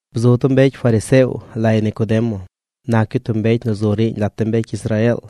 Bzu tub mbecy fariseo lay Nicodemo. Nac yu tub mbecy nu zu riiñ lat de mbecy Israeel.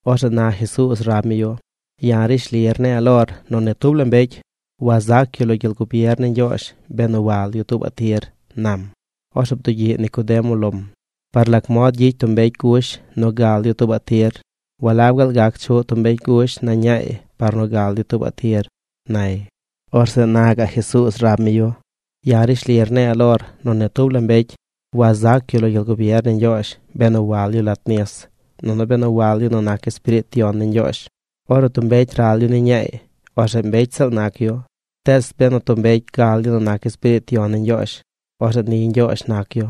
Orzeꞌ na Jesuuz rab mi yu: ―Ya̱ rishli rne̱e̱ lor nu ni tub la mbecy wazac yu lo gyel gubier ni Ñgyoozh benu wal yu tuubaꞌ tir ―nam. Orzeꞌ bdugyiꞌ Nicodemo lom: ―¿Par lac mod gyicy tub mbecy gush nu gal yu tuubaꞌ tir? ¿Walab gaal gac chuꞌ tub mbecy gush nañ ñaay par nu gal yu tuubaꞌ tir? ―nay. Orzeꞌ na gaꞌ Jesuuz rab mi yu: ―Ya̱ rishli rne̱e̱ lor nu ni tub la mbecy wazac yu lo gyel gubier ni Ñgyoozh benu wal yu lat nis, nunu benu wal yu nu nac Espiriit Yon ni Ñgyoozh. Ornu tub mbecy ral yu ni ñaay, orzeꞌ mbecy ziꞌl nac yu. Tees benu tub mbecy gal yu nu nac Espiriit Yon ni Ñgyoozh, orzeꞌ ni Ñgyoozh nac yu.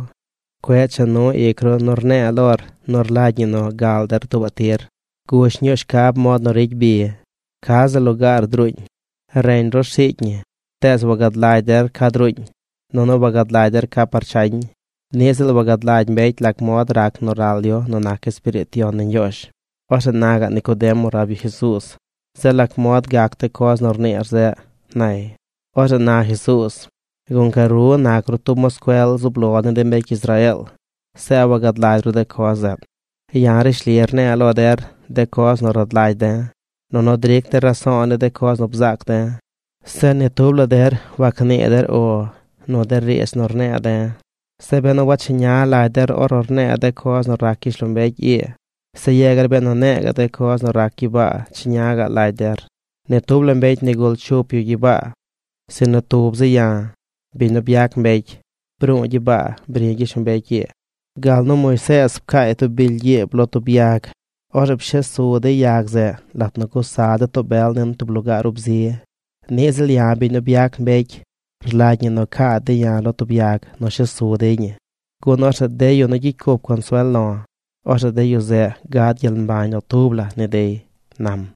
Cueꞌ cha nu ic ru nu rne̱e̱ lor nu rlagy ñi nu gal der tuubaꞌ tir. Gush ñuu shcab mod nu ricy bi. Ca ziꞌl lugaar druuñ. Reñ ru rsiigy ñi, tees wagad lagy der ca druuñ, nunu wagad lagy der ca par chañ. Niꞌ ziꞌl wagad lagy mbecy lac mod rac nu ral yu nu nac Espiriit Yon ni Ñgyoozh. Orzeꞌ na gaꞌ Nicodemo rab yu Jesuuz: ―¿Zeꞌ lac mod gac de coz nu rniir zeꞌ? ―nay. Orzeꞌ na Jesuuz: ―Gunca ru nac ru tub moscuel zub lo ni de mbecy Israeel, ¿zeꞌ a wagad lagy ru de coz zeꞌ? Ya̱ rishli rne̱e̱ lo der de coz nu rad lagy de̱, nunu dric de̱ raso̱o̱ ni de coz nu bzaac de̱. Zeꞌ ni tub la der wagnii der “O” nu de riidz nu rne̱e̱ de̱. Zeꞌ benu wacheña lagy der ornu rne̱e̱ de coz nu rac gyishlombecy ii, zeꞌ yegar benu ne̱e̱ ga̱ꞌ de coz nu rac gyibaa cheña gaꞌ lagy der. ’Ni tub la mbecy nigul chup yu gyibaa, sinu tub zi ya̱, biñ nu byac mbecy, bru̱u̱ gyibaa bri̱ gyishlombecy ii. Gal nu Moisees pcaay tub bily gyiib lo tub yag. Orzeꞌ pshes su dey yag zeꞌ lat nu gusa de too bel nin tub lugaar ub zi, niꞌ ziꞌl ya̱, biñ nu byac mbecy, rlagy ñi nu caa dey ya̱ lo tub yag nu she su dey ñi. Gun orzeꞌ de yu nu gyicy cup consuel lo̱, orzeꞌ de yu zeꞌ gad gyel mbañ nu tub la ni dey ―nam―.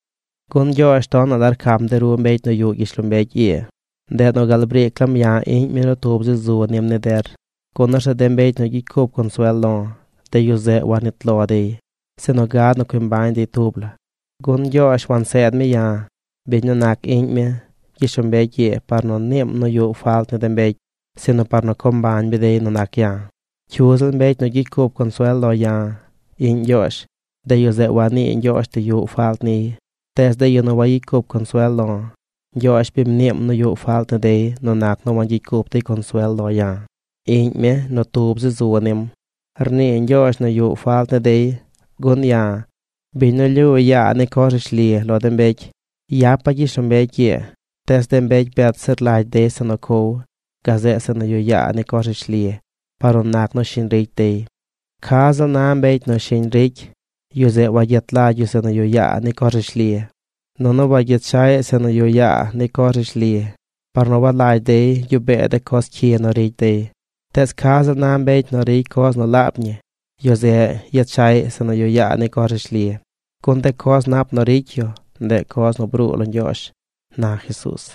’Gun Ñgyoozh tonaꞌ la rcam de ru mbecy nu yuꞌ gyishlombecy ii. Ndeꞌ nu gal briic lam ya̱ iꞌñ mi nu tub zi zu nim ni der. Gun orzeꞌ de mbecy nu gyicy cup consuel lo̱, de yu zeꞌ wanit lo dey, sinu gad nu cui mbañ dey tub la. Gun Ñgyoozh wanseed mi ya̱, biñ nu nac iꞌñ mi, gyishlombecy ii par nu niim nu yuꞌ falt ni de mbecy, sinu par nu co mbañ mi dey nu nac ya̱. ’Cyu ziꞌl mbecy nu gyicy cup consuel lo̱ ya̱, iꞌñ Ñgyoozh, de yu zeꞌ wanii Ñgyoozh ti yuꞌ falt niy. Tees de yu nu wayicy cup consuel lo̱, Ñgyoozh bi mniim nu yuꞌ falt ni dey nu nac nu wangyicy cup dey consuel lo̱ ya̱, iꞌñ mi nu tub zi zu nim. Rnii Ñgyoozh nu yuꞌ falt ni dey gun ya̱, biñ nu lyuu yaa ni coz rishli lo de mbecy, yapa̱ gyishlombecy ii, tees de mbecy bet zir lagy dey zeꞌ nu cow, gazeꞌ zeꞌ nu yuꞌ yaa ni coz rishli par nu nac nu shiñ ricy dey. Ca ziꞌl na mbecy nu shiñ ricy, yu zeꞌ wagyet lagy yu zeꞌ nu yuꞌ yaa ni coz rishli, nunu wagyechaꞌy zeꞌ nu yuꞌ yaa ni coz rishli par nu walagy dey gyuꞌ bee de coz cyi nu ricy dey. Tees ca ziꞌl na mbecy nu ricy coz nu laab ñi, yu zeꞌ yechaꞌy zeꞌ nu yuꞌ yaa ni coz rishli, gun de coz nap nu ricy yu, ndeꞌ coz nu bruu lo Ñgyoozh ―na Jesuuz.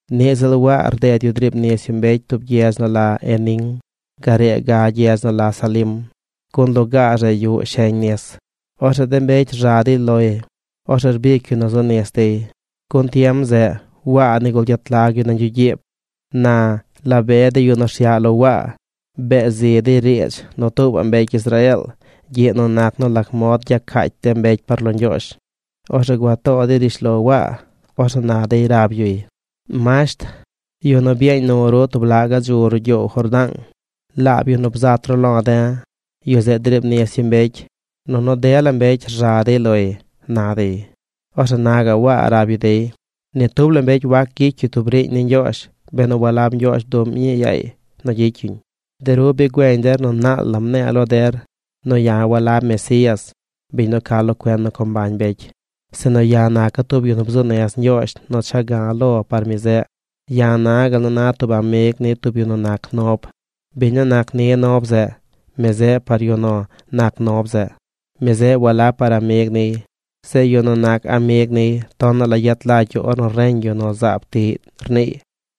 Niꞌ ziꞌl Waa rded yu driib nis yu mbecy tub gyedz nu la Enín garee ga gyedz nu la Salim, gun lugaar zeꞌ yuꞌ sheñ nis. Orzeꞌ de mbecy rza dey loy. Orzeꞌ rbic yu nu zu nis dey. Gun tiem zeꞌ Waa nigul gyet lag yu nañ yuꞌ gyiib. Na, la be de yu nu rsyaꞌ lo Waa, bee zi dey riidz nu tuubaꞌ mbecy Israeel gyiꞌ nu nac nu lac mod gyacaacy de mbecy par lo Ñgyoozh. Orzeꞌ gua too dey rishlo Waa. Orzeꞌ na dey rab yuy: ―Masht, yu nu byeeñ nu ru tub laꞌ gaꞌ dzu ruꞌ gyoow Jordaang, laab yu nu bzat ru lo̱ de̱, yu zeꞌ driib nis yu mbecy. Nunu dela mbecy rza dey loy ―na dey. Orzeꞌ na gaꞌ Waa rab yu dey: ―Ni tub la mbecy wac gyicy yu tub riiñ ni Ñgyoozh benu walab Ñgyoozh bduꞌm ñii yaay nu gyicy yuñ. De ru bi güeñ der nu naal la mne̱e̱ lo der nu ya̱ walab Mesías, biñ nu ca lo cuen nu co mbañ mbecy, sinu ya̱ naca̱ tub yu nu bzuu nez Ñgyoozh nu cha̱ ga̱ lo par mi zeꞌ. Ya̱ na gal nu na tub amig ni tub yu nu nac nob. Biñ nu nac ni nob zeꞌ, mi zeꞌ par yu nu nac nob zeꞌ. Mi zeꞌ walab par amig niy. Zeꞌ yu nu nac amig niy, tonaꞌ la yet lagy yu ornu reñ yu nu zaab tiꞌy rniiy.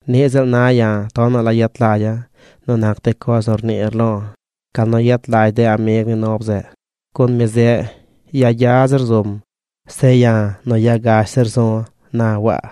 Niꞌ ziꞌl na ya̱ tonaꞌ la yet lagya̱ nu nac de coz nu rniir lo̱, gal nu yet lagy de amig ni nob zeꞌ. Gun mi zeꞌ yagya zir zum. Zeꞌ ya̱ nu yagash zir zu̱ ―na Waa―.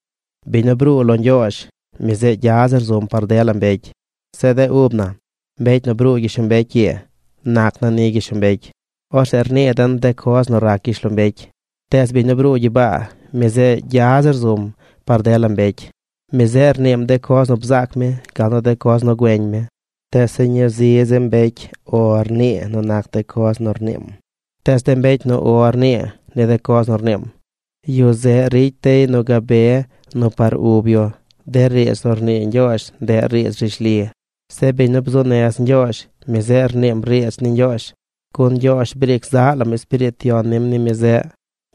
’Biñ nu bruu lo Ñgyoozh, mi zeꞌ gya zir zum par dela mbecy. Zeꞌ de ub na, mbecy nu bruu gyishlombecy ii, nac naa ni gyishlombecy. Orzeꞌ rnii den de coz nu rac gyishlombecy. Tees biñ nu bruu gyibaa, mi zeꞌ gya zir zum par dela mbecy. Mi zeꞌ rniim de coz nu bzaac mi, gal nu de coz nu güeñ mi, tees se ñuu zi zi mbecy “O” rnii nu nac de coz nu rniim. Tees de mbecy nu “O” rnii ni de coz nu rniim, yu zeꞌ ricy dey nu gabe nu par ub yu, de riidz nu rnii Ñgyoozh, ndeꞌ riidz rishli. Zeꞌ biñ nu bzuu nez Ñgyoozh, mi zeꞌ rniim riidz ni Ñgyoozh, gun Ñgyoozh briic zaꞌ lam Espiriit Yon nim ni mi zeꞌ.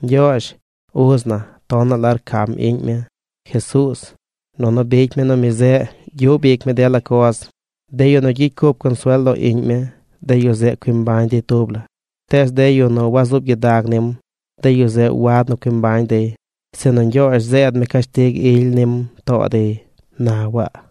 Ñgyoozh, uz na, tonaꞌ la rcam iꞌñ mi, Jesuuz, nunu bicy mi nu mi zeꞌ gyub ic mi dela coz. De yu nu gyicy cup consuel lo iꞌñ mi, de yu zeꞌ cui mbañ dey tub la. Tees de yu nu wazuub gyidag nim, de yu zeꞌ wad nu cui mbañ dey. Sinu Ñgyoozh zeed mi cashtig ily nim too dey ―na Waa.